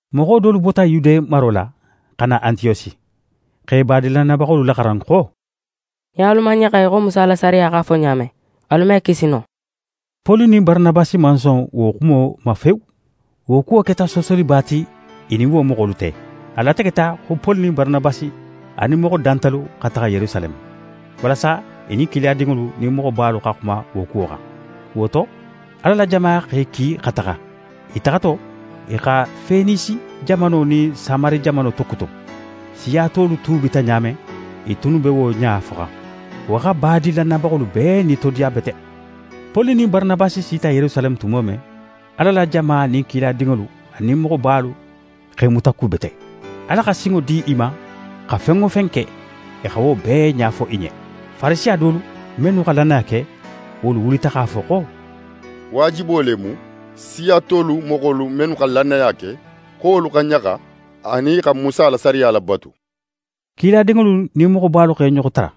Moxo dolu bota Yude maro la, xa na Antiyosi, x'e badin lannayabaxolu laxaran xo: «Nin alu man ɲaxa í xo Musa la sariya x'a fo ɲa men, alu me kisi no.» Poli nin Baranabasi man son wo xumo ma fewu. Wo kuwo keta soosoliba ti i nin wo moxolu te. A lategeta xo Poli nin Baranabasi anin moxo dantalu xa taxa Yerusaleme, walasa i nin kiladinŋolu nin moxobalu xa xuma wo kuwo xan. Wo to, Ala la jama x'e ki xa taxa. I taxato, i xa Fenisi jamano nin Samari jamano tokutun. Siya tolu tuubita ɲa men, i tunnu be wo ɲa foxan. Wo xa badin lannayabaxolu bee nitodiya bete. Poli nin Baranabasi sita Yerusaleme tumo men, Ala la jama nin kiladinŋolu anin moxobalu x'e mutakubete. Ala xa sinŋo di i ma xa fen wo fen ke, i xa wo bee ɲa fo i ɲen. Farisiya dolu, mennu xa lannaya ke, wolu wulita x'a fo xo: «Waajibo le mu, siya tolu moxolu mennu xa lannaya ke, xo wolu xa ɲaxa, anin i xa Musa la sariya labatu.» Kiladinŋolu nin moxobalu x'e ɲoxo tara,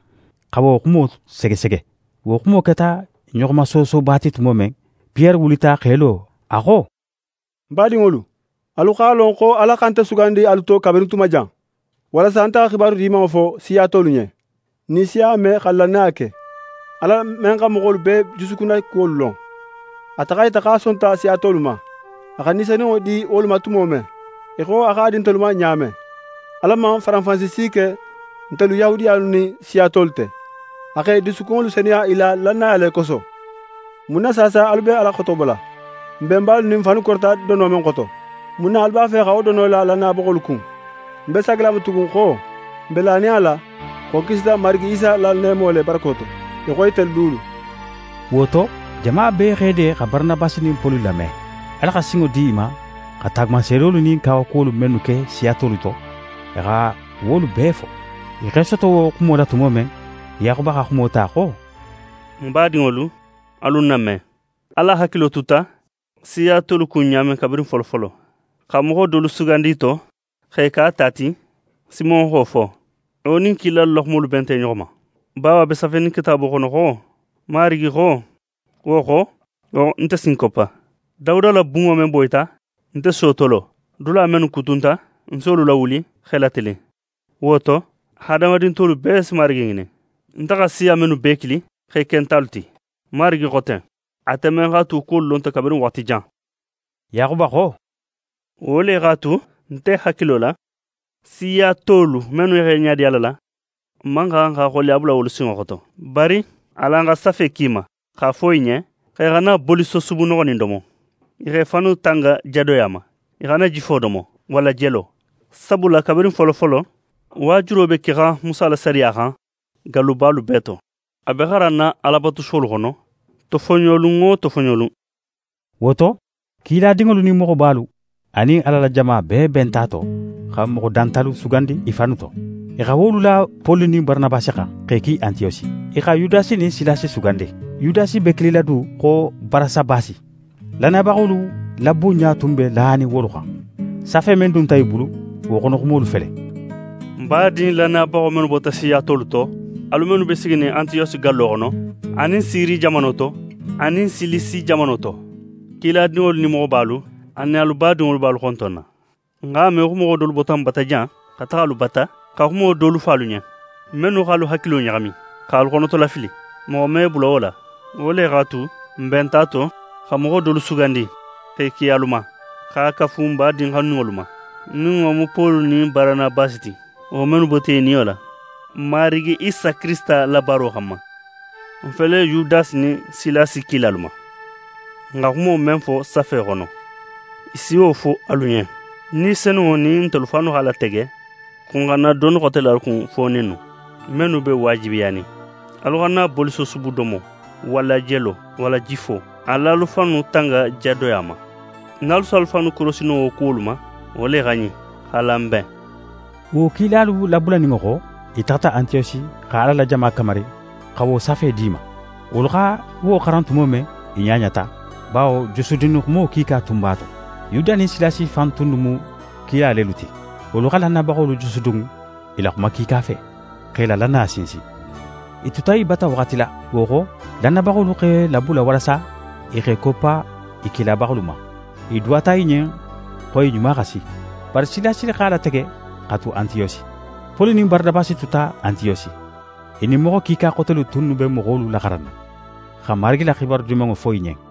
xa wo xumo segesege. Wo xumo keta ɲoxomasoosoba ti tumo men, Piyere wulita x'é lo. A xo: «Ń badinŋolu, alu x'a lon xo Ala xa nte sugandi alu to kabirin tuma jan, walasa nte xa xibaru Dimanŋo fo siya tolu ɲen, nin i si a me xa lannaya ke. Ala men xa moxolu bee jusukunna kuwolu lon, ate x'a yita xo a sonta siya tolu ma, a xa Ni Senunŋo di wolu ma tumo men, í xo a x'a di ntelu ma ɲa men. Ala man faranfansi si ke ntelu Yahudiyalu nin siya tolu te. A x'e jusukunŋolu senuya i la lannaya le koso. Mun na saasa, alu be Ala xotobola? N benbalu nin n fannu korita dono men xoto, mun na alu b'a fe xa wo dono la lannayabaxolu kun? Ń be saagila a ma tugun xo, n be lanin a la xo n kisita Marigi Isa la neemo le barako to, í xo itelu dulu.» Wo to, jama bee x'e de xa Baranabasi nin Poli lame. Ala xa sinŋo di i ma xa taagumanseedolu nin kawakuwolu mennu ke siya tolu to, i xa wolu bee fo. I x'e soto wo xumo la tumo men, Yaxuba xa xumo ta xo: «Ń badinŋolu, alu ń name. Ala hakilo tuta siya tolu kun ɲa men kabirin folofolo, xa moxo dolu sugandi i to, x'e ke a ta ti, Simon xa wo fo. Wo nin kilalu la xumolu benta i ɲoxo ma, bawo a be safenin Kitaabo xono xo: “Marigi xo: Wo xo, nte si ń koppa. Dawuda la bunŋo men boyita, nte si wo tolo. Dula mennu kutunta, ń si wolu lawuli, x'e latilin. Wo to, hadamadin tolu bee si Marigi ŋinin, nte xa siya mennu bee kili x'e ke ń talu ti. Marigi xo ten, ate men x'a tu wo kuwolu lonta kabirin waxati jan.” Yaxuba xo: Wo le x'a tu, nte hakilo la, siya tolu mennu x'e ɲadi Ala la, n man xan xa xoleya bula wolu sinŋo xoto. Bari, alan xa safe ki i ma x'a fo i ɲen xo i xana bolisosubu noxonin domo. I xa i fannu tanga jadoya ma. I xana jifo domo walla jelo. Sabula kabirin folofolo, waajulo be kexan Musa la sariya xan gallubalu bee to, a be xaranna Alabatusuwolu xono tofoɲolun wo tofoɲolun.» Wo to, kiladinŋolu nin moxobalu anin Ala la jama bee benta a to xa moxo dantalu sugandi i fannu to. I xa wolu la Poli nin Baranabasi xan, x'e ki Antiyosi. I xa Yudasi nin Silasi sugandi. Yudasi be kilila du xo Barasabasi. Lannayabaxolu la bunɲa tun be lanin wolu xan. Safe men dunta i bulu, wo xono xumolu fele: «N badin lannayabaxo mennu bota siya tolu to, alu mennu be siginin Antiyosi gallo xono, anin Siri jamano to, anin Silisi jamano to: Kiladinŋolu nin moxobalu anin alu badinŋolu be alu xontonna. N x'a me xo moxo dolu bota n bata jan, xa taxa alu bata, xa xumo dolu fo alu ɲen, mennu x'alu hakilo ɲaxami, x'alu xonotolafili. Moxo man i bula wo la. Wo le x'a tu, n benta a to xa moxo dolu sugandi, x'e ki alu ma, x'a kafu n badin xanuninŋolu ma, nin wo mu Poli nin Baranabasi ti, wo mennu bota i niyo la, n Marigi Isa Kirisita la baaro xanma. N fele Yudasi nin Silasi kila alu ma, n xa xumo men fo safe xono, i si wo fo alu ɲen. Ni Senunŋo nin ntelu fannu x'a latege, xo n xana doni xote la alu kun fo ɲinnu, mennu be waajibiyanin. Alu xana bolisosubu domo, walla jelo, walla jifo. Al'alu fannu tanga jadoya ma. Nin alu si alu fannu korosi no wo kuwolu ma, wo le xa ɲin. X'alan n ben!» Wo kilalu labulaninŋo xo, i taxata Antiyosi xa Ala la jama kamari xa wo safe d'i ma. Wolu xa wo xaran tumo men, i ɲaɲata, bawo jusudunni xumo kiika tun b'a to. Yuda nin Silasi fan tunnu mu kila lelu ti. Wolu xa lannayabaxolu jusudun i la xuma kiika fe, x'e la lannaya sinsin. I tuta i bata waxati la. Wo xo, lannayabaxolu x'e labula walasa i x'e koppa i kilabaxolu ma. I duwata i ɲen xo i ɲuma xa si. [ Bari Silasi x'a latege xa tu Antiyosi.] Poli nin Baranabasi tuta Antiyosi. I nin moxo kiika xotelu tunnu be moxolu laxaranna, xa Marigi la xibaru Dimanŋo fo i ɲen.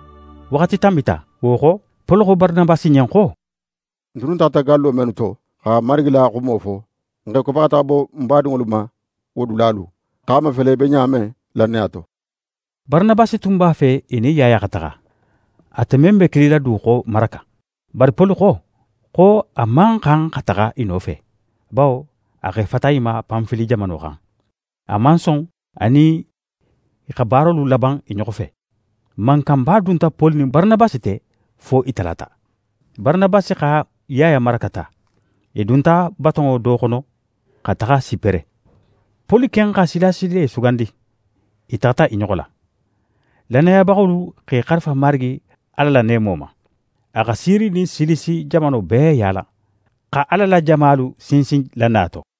Waxati tanbita, wo xo, Poli xo Baranabasi ɲen xo: «N tunnu taxata gallo mennu to, xa Marigi la xumo fo, n x'e koppa xa taxa bo n badinŋolu ma wo dulalu, x'a mafele i be ɲa men lannaya to.» Baranabasi tun b'a fe i nin Yaya xa taxa, ate men be kilila du xo Maraka. Bari Poli xo, xo a man xan xa taxa i nofe. Bawo a x'e fata i ma Panfili jamano xan, a man son a nin i xa baarolu laban i ɲoxo fe. Mankanba dunta Poli nin Baranabasi te fo i talata. Baranabasi xa Yaya Maraka ta. I dunta batonŋo do xono xa taxa Sipere. Poli ken xa Silasi le sugandi, i taxata i ɲoxo la. Lannayabaxolu x'e xarifa Marigi Ala la neemo ma. A xa Siri nin Silisi jamano bee yaala, xa Ala la jamalu sinsin lannaya to.